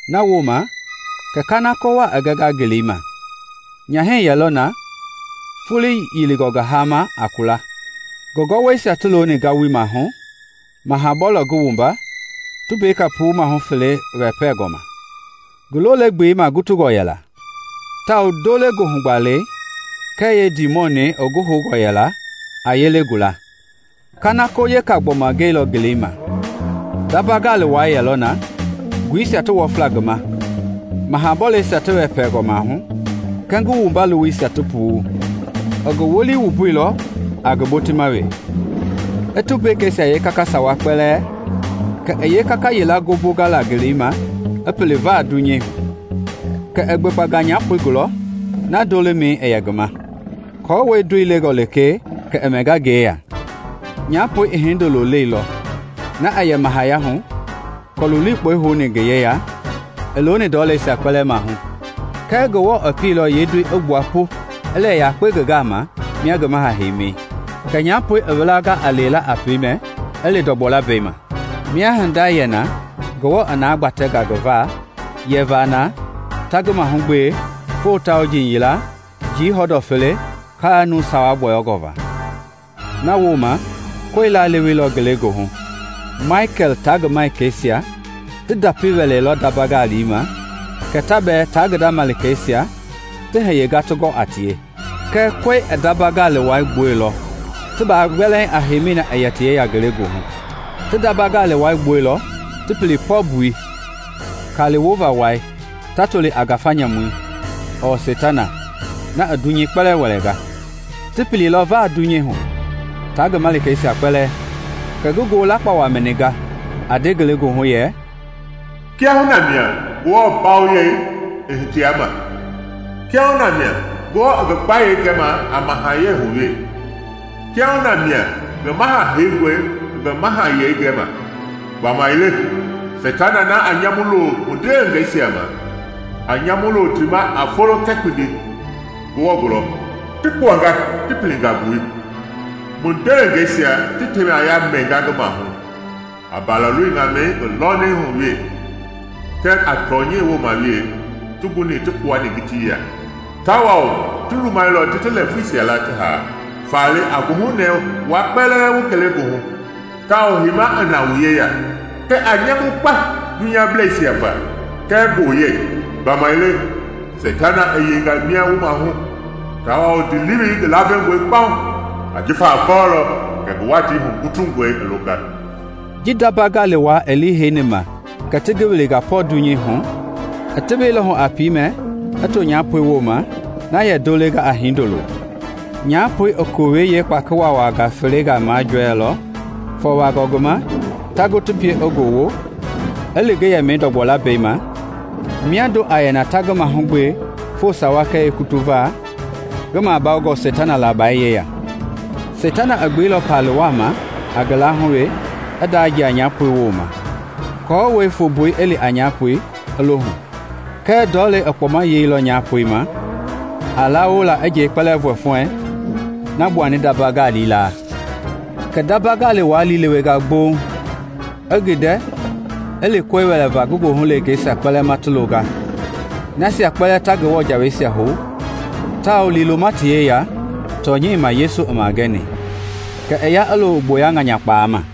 Nawooma kɛ kanako wa i gɛnga ngeleima. Nyahɛi yɛlɔ na, foloi yilingɔ ngi ma a kulei, ngi gɔwɔisia ti looni ngawui maahu maha bɔlei ngi wumba tumbeka puu mahu fele wɛpɛngɔ ma. Ngi lole gbeli magutungɔ yɛla, tawao ndole goohu gbalei kɛɛ yeendimɔnɛi ngi houngɔ yɛla a yele gula. Kanako weka gbɔma gɛilɔ ngeleima. Ndamba gali wai yɛlɔ na nguisia ti wɔfla ngi ma maha bɔleisia ti wɛpɛɛngɔ maahu kɛɛ ngi wumba lowoisia ti puu. I ngi wolii wumbuilɔ a ngi botima we i tumbekeisia kaka sawa kpɛlɛɛ kɛ i yeekaka yila ngombonga la ngeleima i pili vaa dunyei hu. Kɛ i gbekpanga nyapoi gula na ndo lemɛi yɛ ngi ma, aako ndoi lengɔ lekee kɛ i mɛnga ngi yeya. Nyapoi i hindolo leilɔ, na a yɛ mahayahu kɔɔli likpɔi houni ngi yeya i looni ndɔleisia kpɛlɛɛ maahu. Kɛɛ Ngewɔ i pielɔ yeendoi i gbua pu i lɛ yakpe ngi gama mia ngi maha heimi. Kɛ nyapoi i wilanga a lewela a piimɛ i li ndɔgbɔ lambɛi ma, mia hinda yɛ na Ngewɔ i na gbatɛnga ngi va yɛva na ta ngi mahugbe folo tauji yila, njii hɔndɔ fele, njii nuu sawa gbɔyɔngɔ va. Nawooma koe laleweilɔ ngelegoohu. Maikɛl taa ngi Malikeisia ti ndapi wɛlɛlɔ ndamba ngali wai ma, kɛ ta bɛɛ taa ngi da malikeisia ti hiyenga ti gɔ a tie; kɛɛ koe i ndamba ngali wai gbuɛilɔ ti baa gbɛlɛɛŋ a heimi na i yɛ ti yeya ngelegoohu. Ti ndamba gali wai gbuɛilɔ ti pili pɔ mbui -- kali wova wai ta toli a Ngafei ɔɔ Seitana, na i dunyei kpɛlɛɛ wɛlɛnga. Ti pililɔ vaa dunyei hu, taa ngi malikeisia kpɛlɛɛ. Kɛ ngi ngoo lakpawa mɛninga a nde ngelegoohu yɛ, “Kiahuna mia Ngewɔ mbawoyei i hitia ma! Kiahuna mia Ngewɔ i ngi gbayei gɛma a mahayɛi hu we! Kiahuna mia ngi Maha Heingɔ i ngi mahayɛi gɛma! Gbamaile Seitana na a nyamu loo mu ndewengeisia ma, a nyamu loo ti ma a folo kɛɛ kpindi Ngewɔ gulɔ, ti kpuanga ti pilinga mbui. Mu ndewengeisia ti temaya mɛnga ngi maahu a Mbalaloi Ŋamɛi ngi lɔɔmɛi hu we kɛɛ a tɔnyɛi woma we ti guni ti kpuani ngitiya; tawao ti lumailɔ ti ti lɛɛvuisia la ti haa. Faale a goohunɛɛ wua kpɛlɛɛ wu ngelegoohu tawao heima i na wu yeya! Kɛɛ a nyamui kpa dunyableisia va kɛɛ gboyei! Gbamaile Seitana i yeinga mia wu maahu, tawao ndiilewei ngi lavengɔe kpauŋ, ajifa i kɔɔlɔ kɛ ngi watii hugutungɔi i longa.” Ji ndamba gali wai i liiheima kɛ ti ngi wilinga pɔ dunyei hu, i teweilɔ hu a piimɛ i too nyapoi woma na yɛ ndo lenga a hindoloi. Nyapoi i kowɛi yeekpaki waawaa felengaa majɔɛilɔ ti vɔwa ngi ma ta gu ti pie i ngowo i li ngi yɛmɛi ndɔgbɔ lambɛi ma, miando a yɛ na ta ngi mahugbe foo sawa kɛɛ yeekutu va, ngi mabawongɔ seitana labai yeya. Seitana i gbeilɔ palii waa ma a ngi laahu we i ndajia nyapoi woma aako fumbui i li a nyapoi i lo hu. Kɛɛ ndɔlei i kpɔma yelɔ nyapoi ma a lawola njei kpɛlɛɛ i fɔfuɛɛŋ na gbuani ndamba gali laa. Kɛ ndamba gali wai liilewenga gboŋ nyapoi ma, i gindɛ i li koe wɛlɛva ngi goohu leengeisia kpɛlɛɛ ma ti longa, nasia kpɛlɛɛ ta Ngewɔ jaweisia hou tawao liiloma ti yeya tɔnyɛi ma Yesu i magɛni. Kɛ i ya i loo gboya ŋanyakpaama.